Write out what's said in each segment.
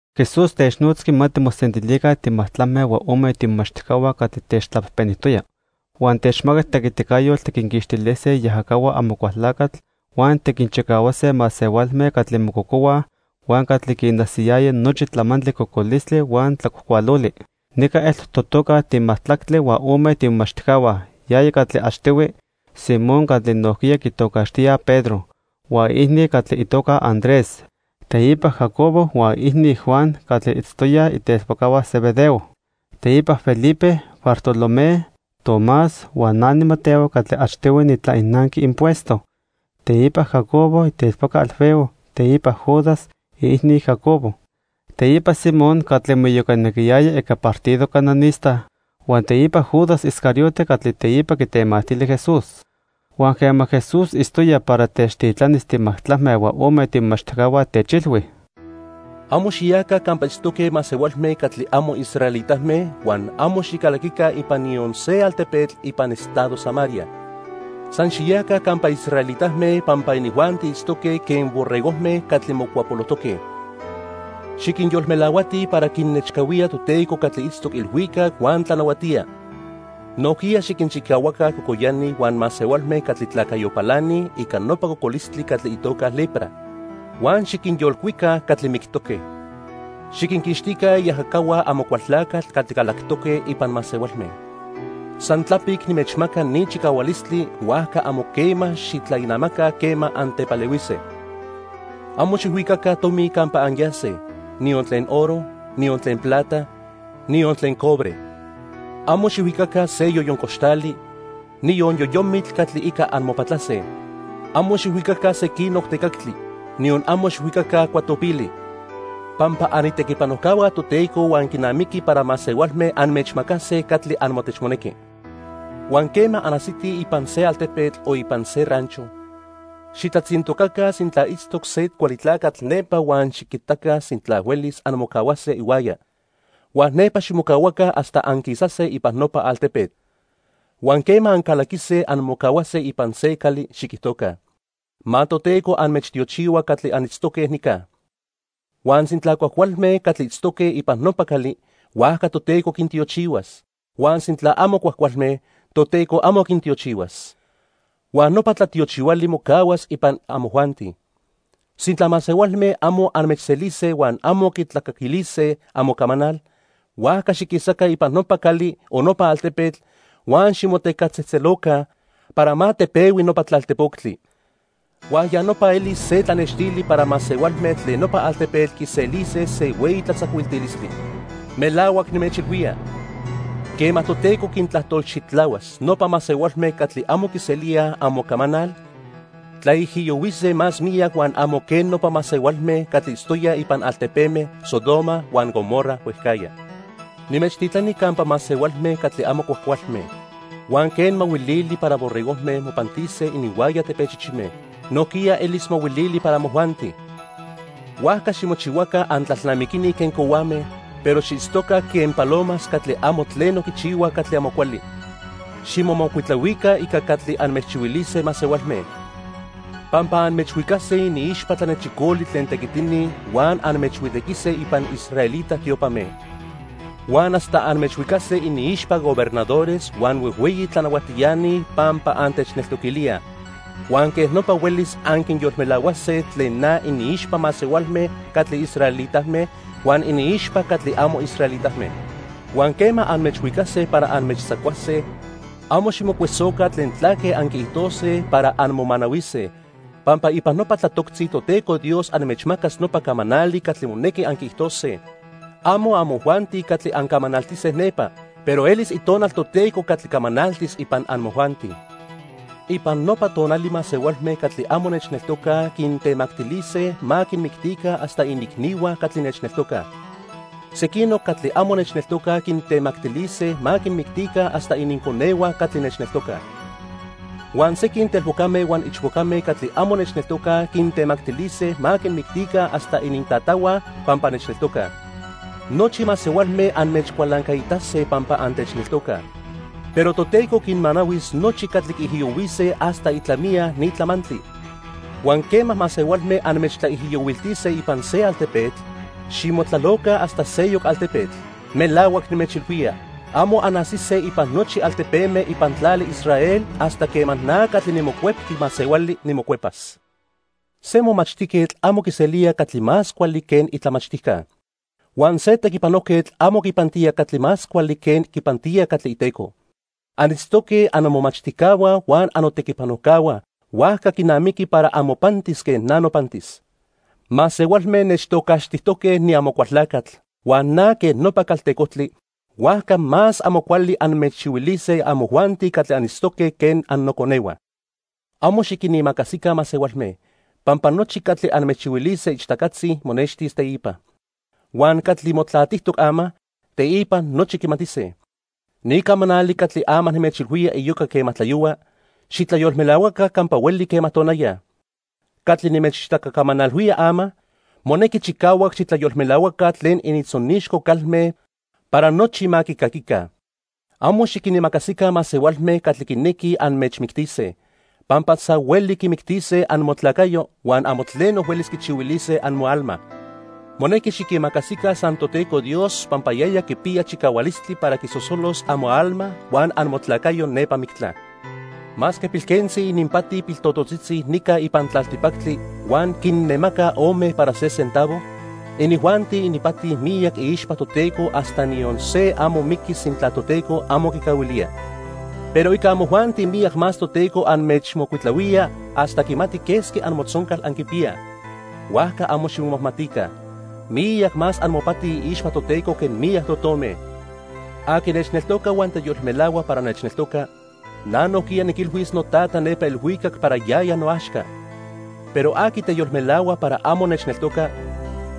Jesús technotzqui ma timosentilica timajtlacme huan ome tiimomachtijcahua catli techtlapejpenijtoya. Huan techmacac tequiticayotl tiquinquixtilise iajacahua Amocualtlacatl huan tiquinchicahuase masehualme catli mococohuaj huan catli quinajsiyayaj nochi tlamantli cocolistli huan tlacuajcualoli. Nica eltoc totoca timajtlactli huan ome tiimomachtijcahua. Yaya catli achtihui: Simón catli nojquiya quitocaxtíaj Pedro, huan iicni catli itoca Andrés, teipa Jacobo huan iicni, Juan, catli itztoyaj itelpocahua Zebedeo. Teipa Felipe, Bartolomé, Tomás huan na niMateo catli achtihui nitlainanqui impuesto. Teipa Jacobo, itelpoca Alfeo. Teipa Judas, iicni Jacobo, teipa Simón catli moiyocanequiyaya ica partido cananista, huan teipa Judas Iscariote catli teipa quitemactili Jesús. Huan quema Jesús itztoya para techtitlanis timajtlacme huan ome tiimomachtijcahua, techilhui: "Amo xiyaca campa itztoque masehualme catli amo israelitame huan amo xicalaquica ipan niyon se altepetl ipan estado Samaria. San xiyaca campa israelitame, pampa inijuanti itztoque quen borregojme catli mocuapolojtoque. Xiquinyolmelahuatij para quinnechcahuía Toteco catli itztoc ilhuicac huan tlanahuatía. Nojquiya xiquinchicahuaca cocoyani huan masehualme catli tlacayo palanij ica nopa cocolistli catli itoca lepra. Huan xiquinyolcuica catli mictoque. Xiquinquixtica iajacahua Amocualtlacatl catli calactoque ipan masehualme. San tlapic nimechmaca ni chicahualistli, huajca amo quema xitlainamaca quema antepalehuise. "Amo xijhuicaca tomi campa anyase, niyon tlen oro, niyon tlen plata, niyon tlen cobre. Amo xijhuicaca se yoyon coxtali, niyon yoyomitl catli ica anmopatlase. Amo xijhuicaca sequinoc tecactli, niyon amo xijhuicaca cuatopili, pampa anitequipanojcahua Toteco huan quinamiqui para masehualme anmechmacase catli amotechmonequi. "Huan quema anajsitij ipan se altepetl o ipan se rancho, xitlatzintocaca sintla itztoc se cuali tlacatl nepa huan xiquitaca sintla huelis anmocahuase ihuaya. Huan nepa ximocahuaca hasta anquisase ipan nopa altepetl. Huan quema ancalaquise anmocahuase ipan se cali, xiquijtoca: 'Ma Toteco anmechtiochihua catli anitztoque nica.' Huan sintla cuajcualme catli itztoque ipan nopa cali, huajca Toteco quintiochihuas; huan sintla amo cuajcualme, Toteco amo quintiochihuas. Huan nopa tlatiochihuali mocahuas ipan amojuanti. Sintla masehualme amo anmechselise huan amo quitlacaquilise amocamanal, huajca xiquisaca ipan nopa cali o nopa altepetl, huan ximotecactzejtzeloca para ma tepehui nopa tlaltejpoctli. Huan ya nopa elis se tlanextili para masehualme tlen nopa altepetl quiselise se hueyi tlatzacuiltilistli. Melahuac nimechilhuía, quema Toteco quintlajtolxitlahuas, nopa masehualme catli amo quiselíaj amocamanal, tlaijiyohuise más miyac huan amo quen nopa masehualme catli itztoyaj ipan altepeme Sodoma huan Gomorra huejcajya. "Nimechtitlani campa masehualme catli amo cuajcualme. Huan quen mahuilili para borregojme mopantise ininhuaya tepechichime, nojquiya elis mahuilili para amojuanti. Huajca ximochihuaca antlalnamiquini quen cohuame, pero xiitztoca quen palomas catli amo tleno quichihuaj catli amo cuali. Ximomocuitlahuica ica catli anmechchihuilise masehualme, pampa anmechhuicase iniixpa tlanechicoli tlen tequitini huan anmechhuitequise ipan israelita tiopame. Huan hasta anmechhuicase iniixpa gobernadores huan huejhueyi tlanahuatiani pampa antechneltoquilíaj. Huan quej nopa huelis anquinyolmelahuase tlen na iniixpa masehualme catli israelitame huan iniixpa catli amo israelitame. Huan quema anmechhuicase para anmechtzacuase, amo ximocuesoca tlen tlaque anquiijtose para anmomanahuise, pampa ipan nopa tlatoctzi Toteco Dios anmechmacas nopa camanali catli monequi anquiijtose. Amo amojuanti catli ancamanaltise nepa, pero elis Itonal Toteco catli camanaltis ipan amojuanti. "Ipan nopa tonali masehualme catli amo nechneltocaj quintemactilise ma quinmictica hasta iniicnihua catli nechneltocaj. Sequinoc catli amo nechneltocaj quintemactilise ma quinmictica hasta ininconehua catli nechneltocaj. Huan sequin telpocame huan ichpocame catli amo nechneltocaj quintemactilise ma quinmictica hasta inintatahua pampa nechneltocaj. Nochi masehualme anmechcualancaitase pampa antechneltocaj, pero Toteco quinmanahuis nochi catli quiijiyohuise hasta itlamiya ni tlamantli. Huan quema masehualme anmechtlaijiyohuiltise ipan se altepetl, ximotlaloca hasta seyoc altepetl. Melahuac nimechilhuía, amo anajsise ipan nochi altepeme ipan tlali Israel hasta quema na catli niMocuepqui Masehuali nimocuepas. "Se momachtijquetl amo quiselía catli más cuali que itlamachtijca. Huan se tequipanojquetl amo quipantía catli más cuali que quipantía catli iteco. Anitztoque annomomachtijcahua huan annotequipanojcahua, huajca quinamiqui para amopantis quen na nopantis. Masehualme nechtocaxtijtoque niAmocualtlacatl huan na quen nopa caltecojtli, huajca más amo cuali anmechchihuilise amojuanti catli anitztoque quen annoconehua. "Amo xiquinimacasica masehualme, pampa nochi catli anmechchihuilise ichtacatzi monextis teipa. Huan catli motlatijtoc ama, teipa nochi quimatise. Ni camanali catli ama nimechilhuía iyoca quema tlayohua, xitlayolmelahuaca campa hueli quema tonaya. Catli nimechichtacacamanalhuía ama, monequi chicahuac xitlayolmelahuaca tlen inintzonixco calme para nochi ma quicaquica. Amo xiquinimacasica masehualme catli quinequij anmechmictise, pampa san huelise quimictise amotlacayo huan amo tleno huelis quichihuilise amoalma. Monequi xiquimacasica san Toteco Dios pampa yaya quipiya chicahualistli para quisosolos amoalma huan amotlacayo nepa mictla. "Masque pilquentzi ininpati piltototzitzi nica ipan tlaltipactli huan quinnemacaj ome para se centavo, inijuanti ipati miyac iixpa Toteco hasta niyon se amo miqui sintla Toteco amo quicahuilía. Pero ica amojuanti miyac más Toteco anmechmocuitlahuía hasta quimati quesqui amotzoncal anquipiyaj. Huajca amo ximomajmatica. Miyac más amopati iixpa Toteco que miyac totome. "Aqui nechneltoca huan teyolmelahua para nechneltoca, na nojquiya niquilhuis noTata nepa ilhuicac para yaya noaxca. Pero aqui teyolmelahua para amo nechneltoca,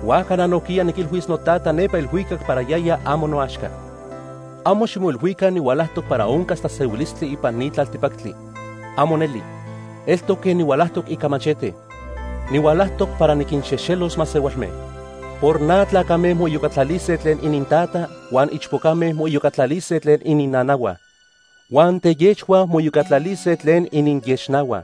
huajca na nojquiya niquilhuis noTata nepa ilhuicac para yaya amo noaxca. "Amo ximoilhuica nihualajtoc para oncas tlasehuilistli ipan ni tlaltipactli. ¡Amo neli! Eltoc quen nihualajtoc ica machete. Nihualajtoc para niquinxejxelos masehualme. Por na tlacame moiyocatlalise tlen inintata, huan ichpocame moiyocatlalise tlen ininnanahua. Huan teyexhua moiyocatlalise tlen ininyexnahua.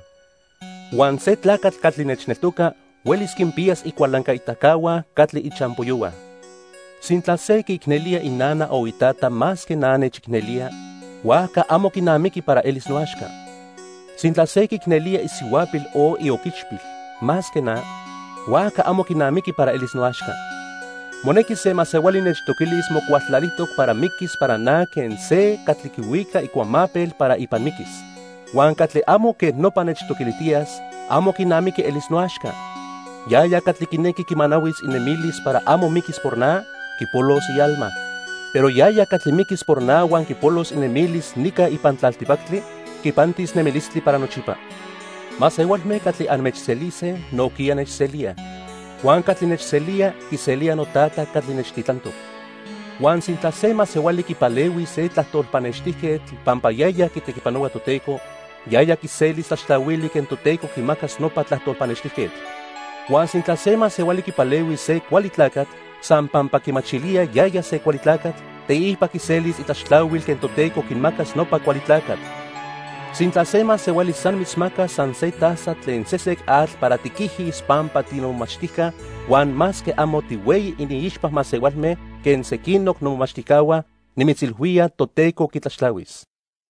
Huan se tlacatl catli nechneltoca huelis quinpiyas icualancaitacahua catli ichampoyohua. "Sintla se quiicnelía inana o itata más que na nechicnelía, huajca amo quinamiqui para elis noaxca. Sintla se quiicnelía isihuapil o ioquichpil más que na, huajca amo quinamiqui para elis noaxca. Monequi se masehuali nechtoquilis mocualtlalijtoc para miquis para na quen se catli quihuica icuamapel para ipan miquis. Huan catli amo quej nopa nechtoquilijtiyas, amo quinamiqui elis noaxca. Yaya catli quinequi quimanahuis inemilis para amo miquis por na, quipolos ialma. Pero yaya catli miquis por na huan quipolos inemilis nica ipan tlaltipactli, quipantis nemilistli para nochipa. "Masehualme catli anmechselise, nojquiya nechselíaj. Huan catli nechselía, quiselía noTata catli nechtitlantoc. Huan sintla se masehuali quipalehuis se tlajtol pannextijquetl pampa yaya quitequipanohua Toteco, yaya quiselis tlaxtlahuili quen Toteco quimacas nopa tlajtol pannextijquetl. Huan sintla se masehuali quipalehuis se cuali tlacatl, san pampa quimachilía yaya se cuali tlacatl, teipa quiselis itlaxtlahuil quen Toteco quimacas nopa cuali tlacatl. Sintla se masehuali san mitzmacas san se taza tlen sesec atl para tiquijis pampa tinomomachtijca, huan masque amo tihueyi iniixpa masehualme quen sequinoc nomomachtijcahua, nimitzilhuía Toteco quitlaxtlahuis."